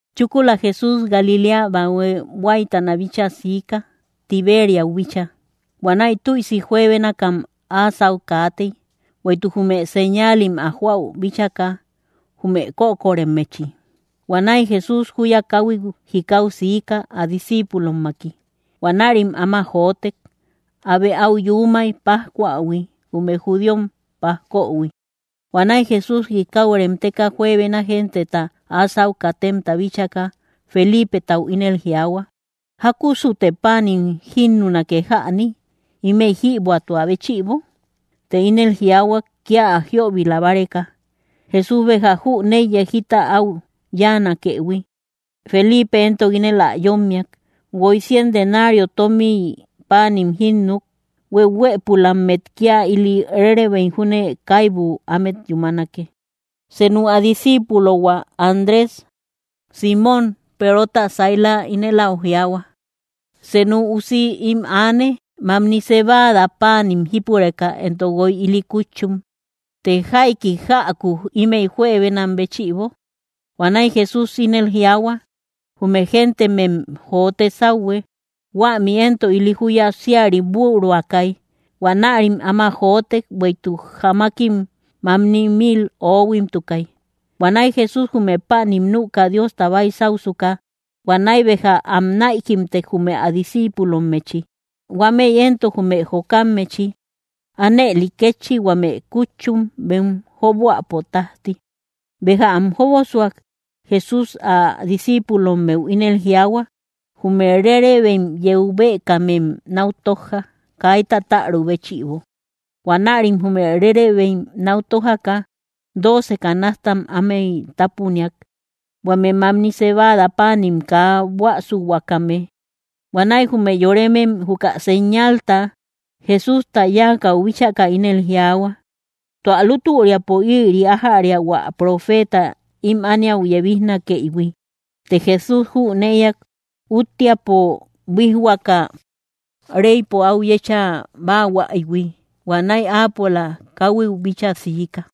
Chúkula Jesús Galiléa bahue huáytana bíchaa siika, Tiberiäu bíchaa. Huanäi tüisi juebénakam áa sáu kaatey, bueïtuk jume señaalim ä joäu bíchaka, jume kökoremmechi. Huanäi Jesús júya káhuit jikau siika, ä discíipulommaki. Huanärim áma jotek. Abe áu yuumay, pájcuahui, jume judíom pajkohui. Huanäi Jesús jikau remteka juebena genteta áa sáu katemta bíchaka, Feliipetau ínel jiaahua: —¿Jákusute páanim jínnunake jäni? ¿Ímëi jïbuätua béchïbo? Të ínel jiaahuak, kía ä jiöbila báreka; Jesús béja jüneiyay jita áu yáanakëhui. Feliipe éntok ínel ä yómmiak: —Guoy cien denario tómiy páanim jínnuk, hueuhuëpulammet kía ili rérebeim júne kaibu ámet yúmanake. Senu ä disciipulohua, Andrés, Símon Perota saila ínel áu jiaahua: —Senu usi ím aane, mamni cebada páanim jípureka éntok guoy ili kútchum; të ¿jaiki jäku ímëi juebenam béchïbo? Huanäi Jesús ínel jiaahua: —Jume géntemem jote sáuhue. Huämi éntok ili júya síari büruakay. Huanärim áma jotek, bueïtuk jamakim mamni mil oohuimtukay. Huanäi Jesús jume páanim nüka Diosta baysausuka, huanäi béja am näikimtek jume ä discíipulommechi, huámëi éntok jume jokammechi; ánëli kétchi huame kútchum, bem jóboäpo tájti. Béja am jóboasuk, Jesús ä discíipulommeu ínel jiaahua: —Jume rérebeim yeu bëkamem náu tójja, kaita täru béchïbo. Huanärim jume rérebeim náu tójaka, dooce canastam ámey tápuniak, huame mamni cebada páanim kaa buäsuhuakame. Huanäi jume yoremem, juka señalta Jesústa yáakäu bíchaka, ínel jiaahua: —Tua lútüriapo ïri ájäria hua profeeta ímï ániau yebijnakëihui. Të Jesús jünëiak útteapo buíjhuaka reypo áu yecha báahuaïhui; huanäi áapola káhuiu bíchaa siika.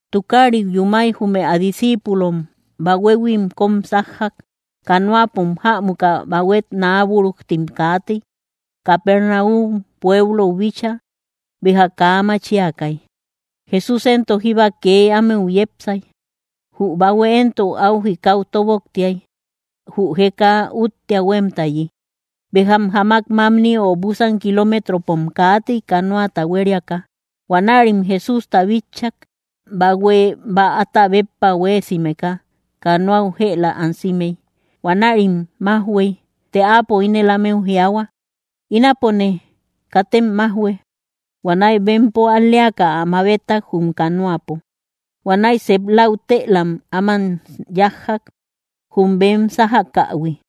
Tukariu yúmay, jume ä discíipulom bahuehuim kóm sájjak. Canoapom jämuka, bahuet naa búrujtim kaatey, Capernaum pueblou bíchaa. Béja kaa machiakay; Jesús éntok jíba kee ámeu yepsay. Jü bahue éntok áu jikau tóboktiay, jü jeka úttea huémtayi. Béjam jamak mamni o búsan kiloometropom kaatey canoata hueriaka, huanärim Jesústa bitchak. Bahue bäata béppa huéesimeka canoau jëla ansimey. Huanärim májhuey. Të áapo ínel ámeu jiaahua: —¡Ínapone, katem májhue! Huanäi bempo al‑leaka ä mabetak jum canoapo. Huanäi sep lautëlam áman yájjak, jum bem sájakähui.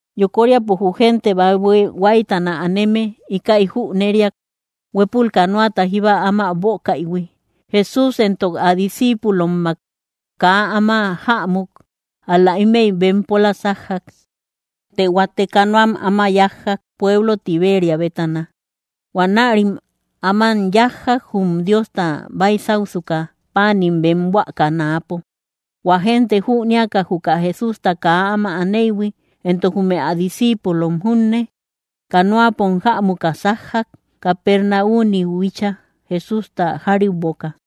Yokoríapo jü génte bahue huáytana aneme íkäi jüneriak: huépul canoata jíba áma bókaïhui. Jesús éntok ä discíipulommak kaa áma jämuk, ál‑la ímëi bempola sájjak. Të huate canoam áma yájjak, pueblo Tiberia bétana. Huanärim áman yájjak, jum Diosta baysausuka páanim bem buakä náapo. Huä génte jünéaka juka Jesústa kaa áma aneïhui éntok jume ä discíipulom junne, canoapom jämuka sájjak, Capernauniu bíchaa, Jesústa járiuboka.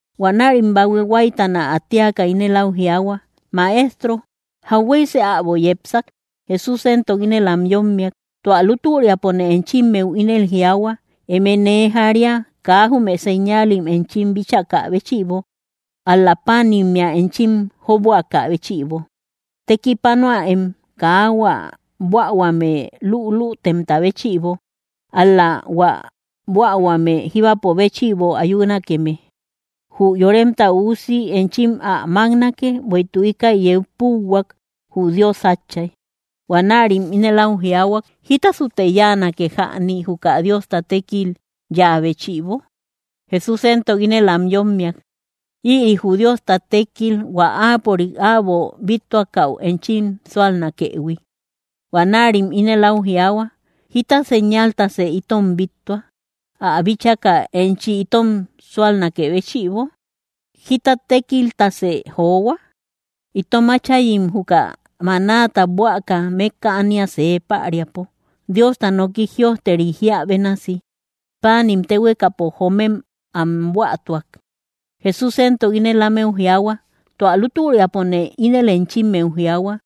Huanärim bahue huáytana ä téaka ínel áu jiaahua: —Maestro, ¿jahueysë äbo yepsak? Jesús éntok ínel am yómmiak: —Tua lútüriapone enchimmeu ínel jiaahua: Eme nee jaria, kaa jume señaalim enchim bíchakä béchïbo, ál‑la páanimmea enchim jóboakä béchïbo. Tekipanoäem, kaa hua buähuame lülütemta béchïbo, ál-la hua buähuame jíbapo béchïbo ayunakeme. Jü Yoremta Üusi enchim ä máknake; bueïtuk íkäi yeu púuhuak, jü Dios Átchay. Huanärim ínel áu jiaahua: —¿Jítasute yáanake jäni, juka Diosta tékil yáa béchïbo? Jesús éntok ínel am yómmiak: —Ïri jü Diosta tékkil, hua áapörik äbo bíttuakäu enchim súalnakëhui. Huanärim ínel áu jiaahua: —¿Jíta señaltasë itom bíttua, ä bíchaka enchi itom súalnakë béchïbo? ¿Jíta tékiltasë johua? Itom áchayim juka manáta buäka mékka ánia see päriapo, Diosta noki jïojteri jíä bénasi: “Páanim téhuekapo joomem am buätuak.” Jesús éntok ínel ámeu jiaahua: —Tua lútüriapone ínel enchimmeu jiaahua: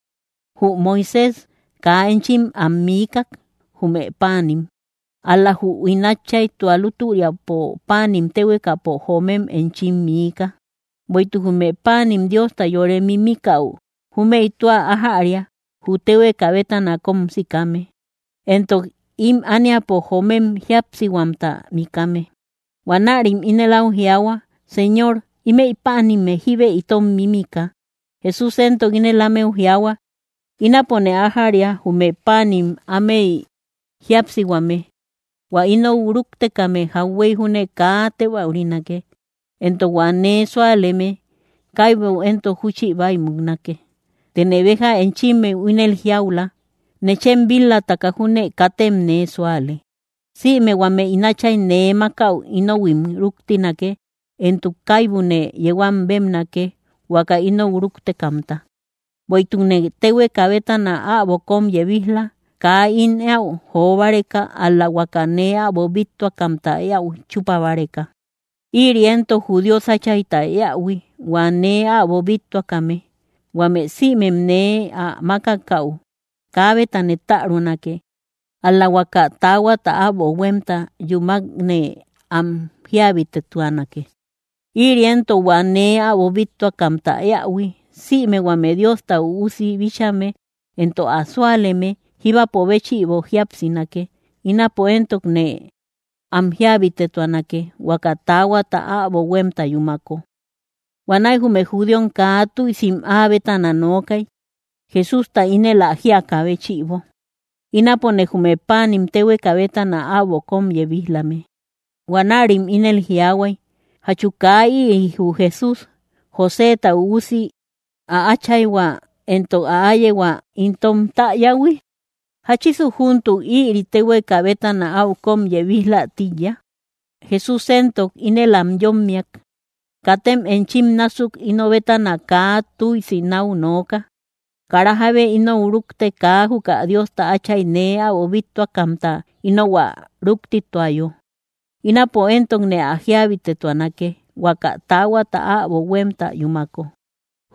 jü Moisés kaa enchim am miikak, jume páanim; ál‑la jü ín Átchay tua lútüriapo páanim téhuekapo joomem enchim miika. Bueïtuk jume páanim Diosta yore mímikäu, júmëi tua ájäria: jü téhueka bétana kóm sikame, éntok ím ániapo joomem jíapsihuamta mikame. Huanärim ínel áu jiaahua: —Señor, ímëi páanim jíbe itom mímika. Jesús éntok ínel ámeu jiaahua: —Ínapone ájäria jume páanim ámey jíapsihuame. Huä inou rúktekame jauhuey júne kaa tébäurinake, éntok hua nee súaleme kaibu éntok júchi bäi muknake. Tëne béja enchimmeu ínel jiaula: Nechem bil-lataka júne katem nee súale. Sïme huame ín Áchay nee mákäu inohuim rúktinake; éntok kaibune yeu am bébnake, huaka inou rúktekamta. Bueïtukne téhueka bétana äbo kóm yebij‑la, kaa ín éäu jo báreka, ál‑la huaka nee äbo bíttuakamta éäu chúpa báreka. Ïri éntok jü Dios Áchayta éähui, hua nee äbo bíttuakame: huame sïmem nee ä mákakäu, kaabetane tärunake, ál-la huaka taahuata äbo huémta yúmakne am jíabitetuanake. Ïri éntok hua nee äbo bíttuakamta éähui sïme huame Diosta Üusi bíchame éntok ä súaleme, jíbapo béchïbo jíapsinake; ínapo éntokne am jíabitetuanake huaka taahuata äbo huémta yúmako. Huanäi jume judíom kaa tüisim ä bétana nookay, Jesústa ínel ä jíakä béchïbo: “Ínapone jume páanim téhueka bétana äbo kóm yebij‑lame.” Huanärim ínel jiaahuay: —¿Jachu kaa ïri jü Jesús, Joséta üusi, ä áchayhua éntok ä áyehua itom täyähui? ¿Jáchisu júntuk ïri téhueka bétana áu kóm yebij‑la tíiya? Jesús éntok ínel am yómmiak: —Katem enchim násuk ino bétana kaa túisi náu nooka. Kara jábe inou rúkte, kaa juka Dios Áchayta nee äbo bíttuakamta inou ä rúktituayo; ínapo éntokne ä jíabitetuanake, huaka taahuata äbo huémta yúmako.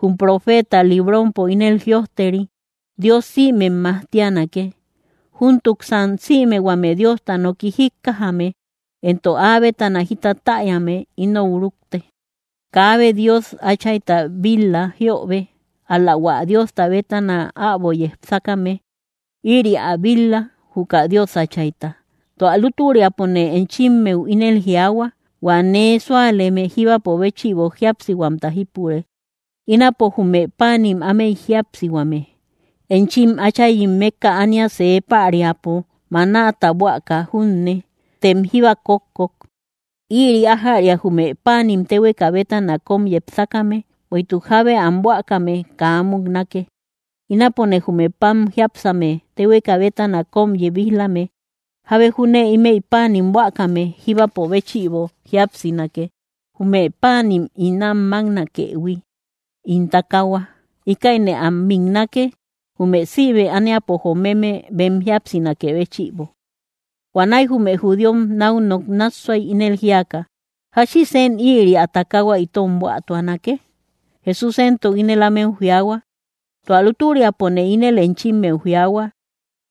Jum profeetam librompo ínel jïojteri: “Dios sïmem majtianake.” Júntuksan sïme huame Diosta noki jíkkajame, éntok áa bétana jita täyame, inou rúkte. ’Kaabe Dios Áchayta bil-la jiöbe, ál‑la hua Diosta bétana äbo yepsakame. Ïri ä bil-la, juka Dios Áchayta. Tua lútüriapone enchimmeu ínel jiaahua: Huä nee súaleme jíbapo béchïbo jíapsihuamta jípure. Ínapone jume páanim ámey jíapsihuame. Enchim áchayim mékka ánia see päriapo manáta buäka junne, tem jíba kókkok. Ïri ájäria jume páanim téhueka bétana kóm yepsakame, bueïtuk jábe am buäkame kaa muknake. Ínapone jume pan jiápsame téhueka bétana kóm yebij-lame; jábe júne ímëi páanim buäkame jíbapo béchïbo jíapsinake. Jume páanim ín am máknakëhui, ín takaahua. Íkäine am miknake, jume sïme ániapo jomeme bem jíapsinakë béchïbo. Huanäi jume judíom náu nok nássuay, ínel jíaka: —¿Jáchisen ïri ä takaahua itom buätuanake? Jesús éntok ínel ámeu jiaahua: —Tua lútüriapone ínel enchimmeu jiaahua: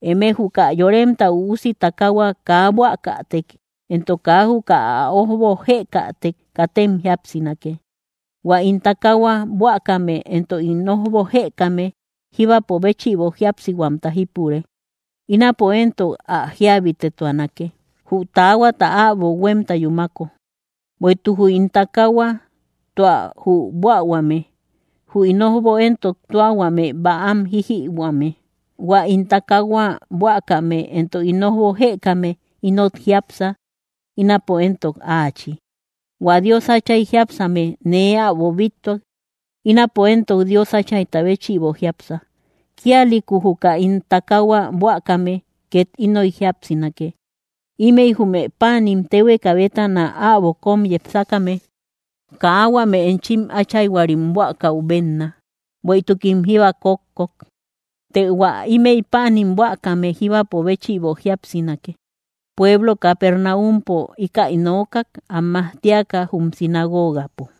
Eme juka Yoremta Üusi takaahua kaa buäkätek éntok kaa juka ä ójbo jëkätek, katem jíapsinake. Huä ín takaahua buäkame éntok ín ójbo jëkame jíbapo béchïbo jíapsihuamta jípure; ínapo éntok ä jíabitetuanake, jü taahuata äbo huémta yúmako. Bueïtuk jü ín takaahua tua jü buähuame; jü ín ójbo éntok tua huame bäam jijïhuame. Huä ín takaahua buäkame éntok ín ójbo jëkame ínot jiápsa, ínapo éntok áachi. Huä Dios Áchay jiápsame nee äbo bíttuak, ínapo éntok Dios Áchayta béchïbo jiápsa; kíalïku juka ín takaahua buäkame két ínoy jíapsinake. Ímëi jume páanim téhueka bétana äbo kóm yepsakame. Kaa huame enchim áchayhuarim buäkäu bénna, bueïtukim jíba kókkok. Të hua ímëi páanim buäkame jíbapo béchïbo jíapsinake. Pueblo Capernaumpo íkäi nookak, am majtiaka jum sinagogapo.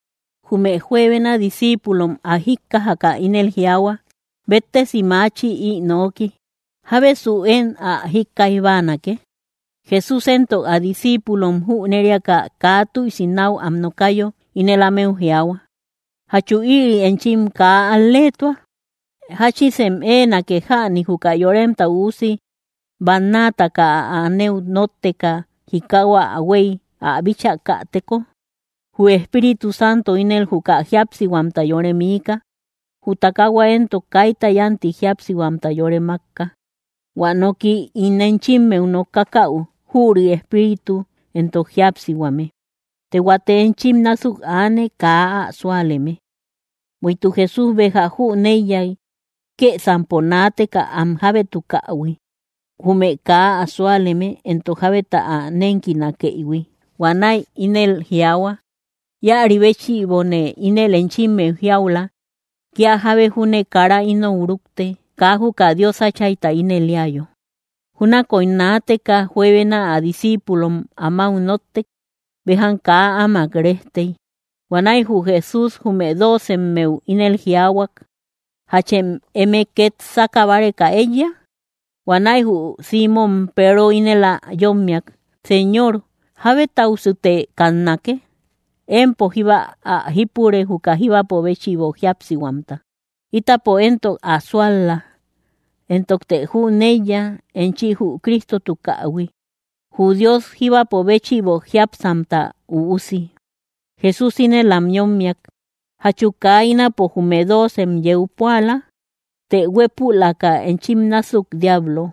Jume juebena discíipulom ä jíkkajaka ínel jiaahua: —¡Béttesi maachi, ï nooki! ¿Jábesu én ä jíkkaij báanake? Jesús éntok ä discíipulom jüneriaka, kaa tüisi náu am nokayo, ínel ámeu jiaahua: —¿Jachu ïri enchim kaa al‑leetua? ¿Jáchisem éenake jäni, juka Yoremta Üusi bannaataka ä anëu nótteka jikau ä huéy ä bíchäkateko? Jü Espíritu Santo ínel juka jíapsihuamta yore miika; jü takaahua éntok kaita yánti jíapsihuamta yore mákka. Huä nooki ín enchimmeu nokakäu, jüri Espíritu éntok jíapsihuame. Të huate enchim násuk aane, kaa ä súaleme. Bueïtuk Jesús béja jüneiyay kësampo naateka am jábétukähui jume kaa ä súaleme, éntok jábeta ä nénkinakëihui. Huanäi ínel jiaahua: —Íäri béchïbone ínel enchimmeu jiaula: Kía jábe júne kara inou rúkte, kaa juka Dios Áchayta ínel éayo. Júnakoy naateka juebena ä discíipulom amáu nóttek; béjam kaa áamak rejtey. Huanäi jü Jesús jume doocemmeu ínel jiaahuak: —¿Jachem eme két sáka báreka éiya? Huanäi jü Símon Peero ínel ä yómmiak: —Señor, ¿jábetausute kannake? Empo jíba ä jípure, juka jíbapo béchïbo jíapsihuamta. Ítapo éntok ä sual-la, éntokte jüneiya enchi jü Cristotukähui, jü Dios jíbapo béchïbo jiápsamta Üusi. Jesús ínel am yómmiak: —¿Jachu kaa ínapo jume doocem yeu púala? ¡Të huépülaka enchim násuk diablo!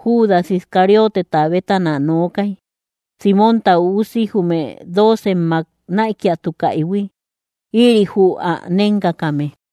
Judas Iscarioteta bétana nookay, Símonta üusi, jume doocemmak näikiatukaïhui; ïri jü ä nénkakame.